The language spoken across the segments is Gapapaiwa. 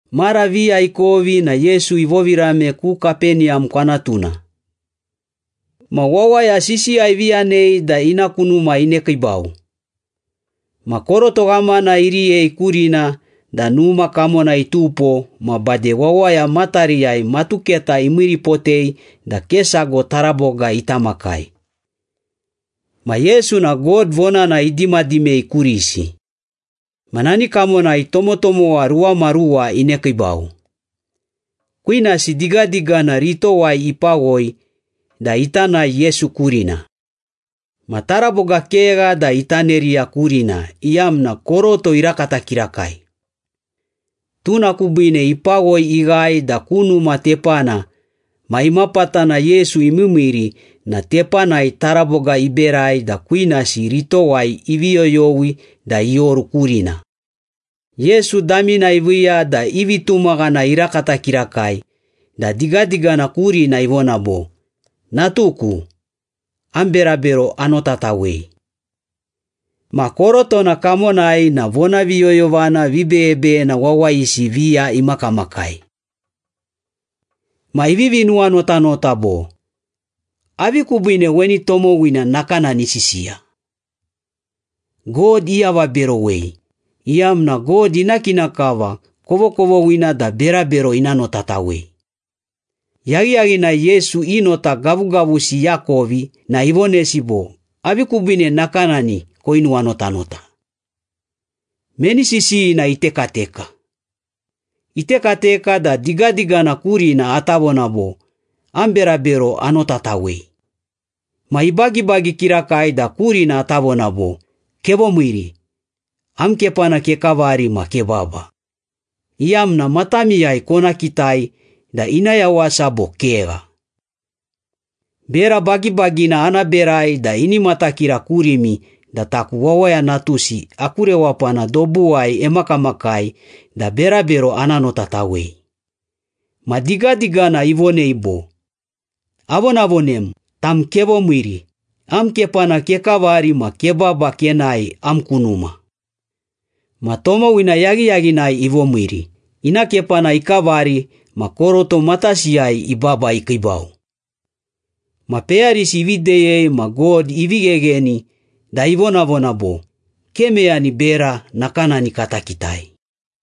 Mara viya ikovi na Yesu ivovirame ku Kapeniyam kwanatuna. Ma wawaya sisiya ivi yanei da ina ku numa inekiibau. Ma koroto ghamana iriyei kurina da numa kamona itupo ma bade wawaya matariyai matuketa imiiripotei da ke sago taraboga ita makai. Ma Yesu na God vonana idimadimei kurisi. Ma nani kamonai tomotomowa ruwamaruwa inekiibau. Kwinasi digadigana ritowai ipawoi da ita nae Yesu kurina. Ma taraboga kegha da ita neriya kurina iyamna koroto irakata kirakai. Tuna kubiine ipawoi ighae da ku numa tepana ma imapatana Yesu imiimiiri na tepanai taraboga iberai da kwinasi ritowai ivi yoyowi da ioru kurina. Yesu damina iviiya da i vitumaghana irakata kirakai da digadigana kurina ivona bo, “Natuku, am berabero anotatawei.” Ma korotona kamonai na vonaviyoyovana vibeyebeyena wawayisi viya imakamakai. Ma ivivi nuwanotanota bo, “Avi kubiine weni tomowina nakanani isisiya? God iavaberowei, iyamna God ina kina kava kovokovoghina da berabero ina notatawei.” Yaghiyaghinai Yesu i nota gavugavusi iakovi na ivonesi bo, “Avi kubiine nakanani koinuwanotanota? Meni sisiyina itekateka? Itekateka da digadigana kurina ata vona bo, ‘Am berabero anotatawei.’ Ma ibagibagi kirakai da kurina ata vona bo, ‘Kevomiiri, am kepana kekavari ma kebaba,’ iyamna matamiyai kona kitai da ina yawasa bo kegha. Bera bagibagina ana berai da ini matakira kurimi da taku Wawaya Natusi aku rewapana dobuwai emakamakai da berabero ana notatawei.” Ma digadigana ivonei bo, “Avonavonem, tam kevomiiri, am kepana kekavari ma kebaba kenae am ku numa.” Ma tomowina yaghiyaghinai ivomiiri, ina kepana ikavari ma koroto matasiyai ibaba ikiibau. Ma peyarisi ivi deyei ma God ivi ghegheni da ivonavona bo, “Ke meyani bera nakanani kata kitai!”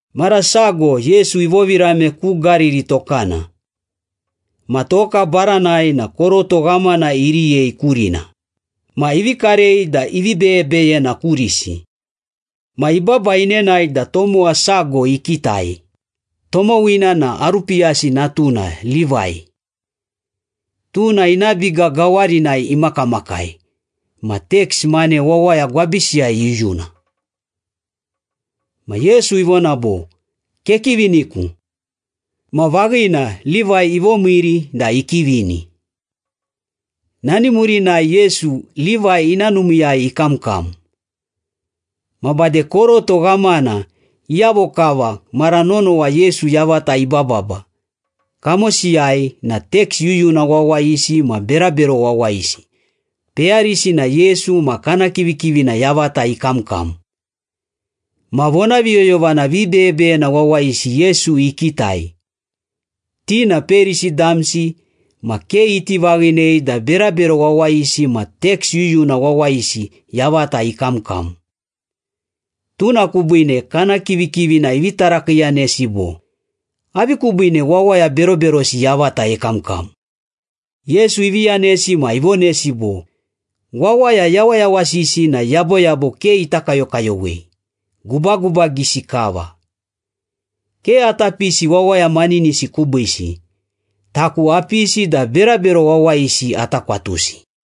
Mara sago Yesu ivovirame ku Gariri tokana. Ma toka baranai na koroto ghamana iriyei kurina, ma ivi karei da ivi beyebeyena kurisi. Ma ibaba inenae da tomowa sago ikitai, tomowina na Arupiyasi natuna Livai. Tuna ina biga gawarinai imakamakai ma teks mane wawaya gwabisiyai iyuyuna. Ma Yesu ivona bo, “Kekiviniku.” Ma vaghina Livai ivomiiri da ikivini. Nani murinai Yesu, Livai ina numiiyai ikamkam. Ma bade koroto ghamana iyavo kava mara nonowa Yesu yavata ibababa, kamosiyai na teks yuyuna wawayisi ma berabero wawayisi, peyarisi na Yesu ma kana kivikivina yavata ikamkam. Ma vonaviyoyovana vibeyebeyena wawayisi Yesu ikitai. Ti na Perisi damsi ma ke iti vaghinei da berabero wawayisi ma teks yuyuna wawayisi yavata ikamkam. Tuna kubiine kana kivikivina ivi tarakiiyanesi bo, “Avi kubiine wawaya beroberosi yavata ekamkam?” Yesu ivi yanesi ma ivonesi bo, “Wawaya yawayawasisi na yaboyabo ke ita kayokayowei, gubagubagisi kava. Ke ata pisi wawaya maninisi kubiisi. Taku apisi da berabero wawayisi ata kwatusi.”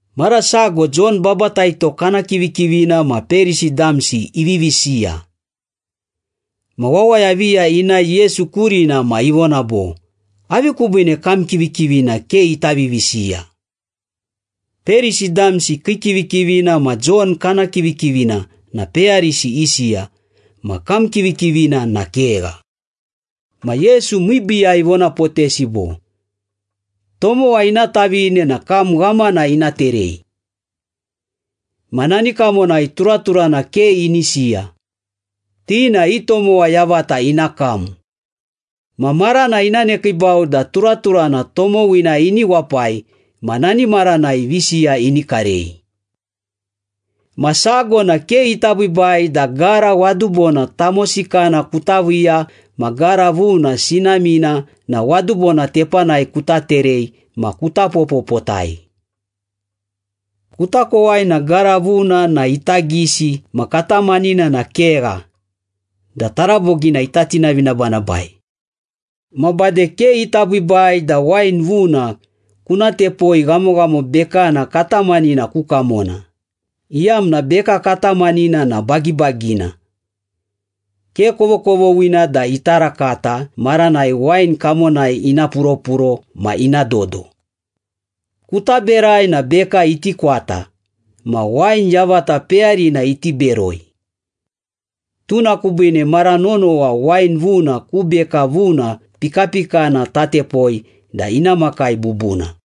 Mara sago Jon Babataito kana kivikivina ma Perisi damsi ivivi siya. Ma wawaya viya inae Yesu kurina ma ivona bo, “Avi kubiine kam kivikivina ke ita vivisiya? Perisi damsi kii kivikivina ma Jon kana kivikivina na peyarisi isiya, ma kam kivikivina na kegha.” Ma Yesu miibiiyai ivonapotesi bo, “Tomowa ina tavine na kam ghamana ina terei. Ma nani kamonai turaturana ke ini siya, ti na i tomowa yavata ina kam. Ma marana ina nekiibau da turaturana tomowina ini wapai ma nani maranai visiya ini karei.” “Ma sago na ke ita biibai da gara wadubona tamosikana kuta viiya ma gara vuna sinamina na wadubona tepanai kuta terei ma kuta popopotai. Kuta kowai na gara vuna na ita gisi ma katamanina na kegha da tarabogina ita tinavinabanabai. Ma bade ke ita biibai da wain vuna kuna tepoi ghamoghamo bekana katamanina ku kamona, iyamna beka katamanina na bagibagina. Ke kovokovoghina da ita rakata maranai wain kamonai ina puropuro ma ina dodo. Kuta berai na beka iti kwata, ma wain yavata peyarina iti beroi. Tuna kubiine mara nonowa wain vuna ku beka vuna pikapikana tatepoi da ina makai bubuna.”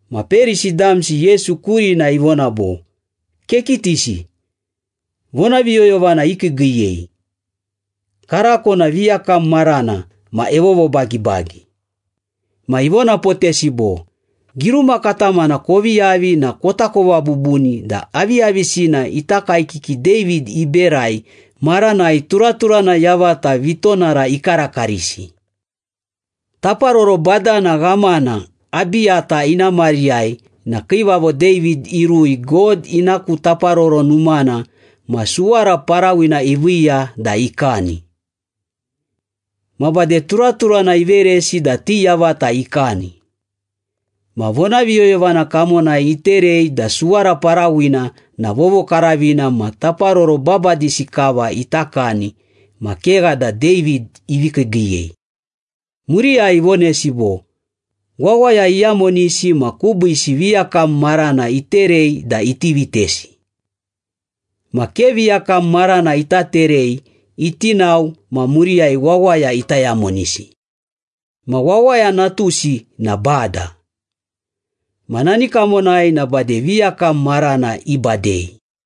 Ma Perisi damsi Yesu kurina ivona bo, “Kekitisi, vonaviyoyovana ikiigiiyei. Karako na viyakam marana ma evovobagibagi.” Ma ivonapotesi bo, “Giruma katamana kovi yavi na kotakova bubuni da aviyavisina ita kaekiki David iberai maranai turaturana yavata vitonara ikarakarisi. Taparoro badana ghamana Abiyata ina mariyai na Kiivavo David irui God ina ku Taparoro Numana ma suwara parawina iviiya da ikani. Ma bade turaturana iveresi da ti yavata ikani. Ma vonaviyoyovana kamonai iterei da suwara parawina na vovokaravina ma taparoro babadisi kava ita kani ma kegha da David ivi kiigiiyei.” Muriyai ivonesi bo, “Wawaya iyamonisi ma kubiisi viyakam marana iterei da iti vitesi. Ma ke viyakam marana ita terei iti nao ma muriyai wawaya ita yamonisi. Ma Wawaya Natusi na Bada. Ma nani kamonai na bade viyakam marana ibadei.”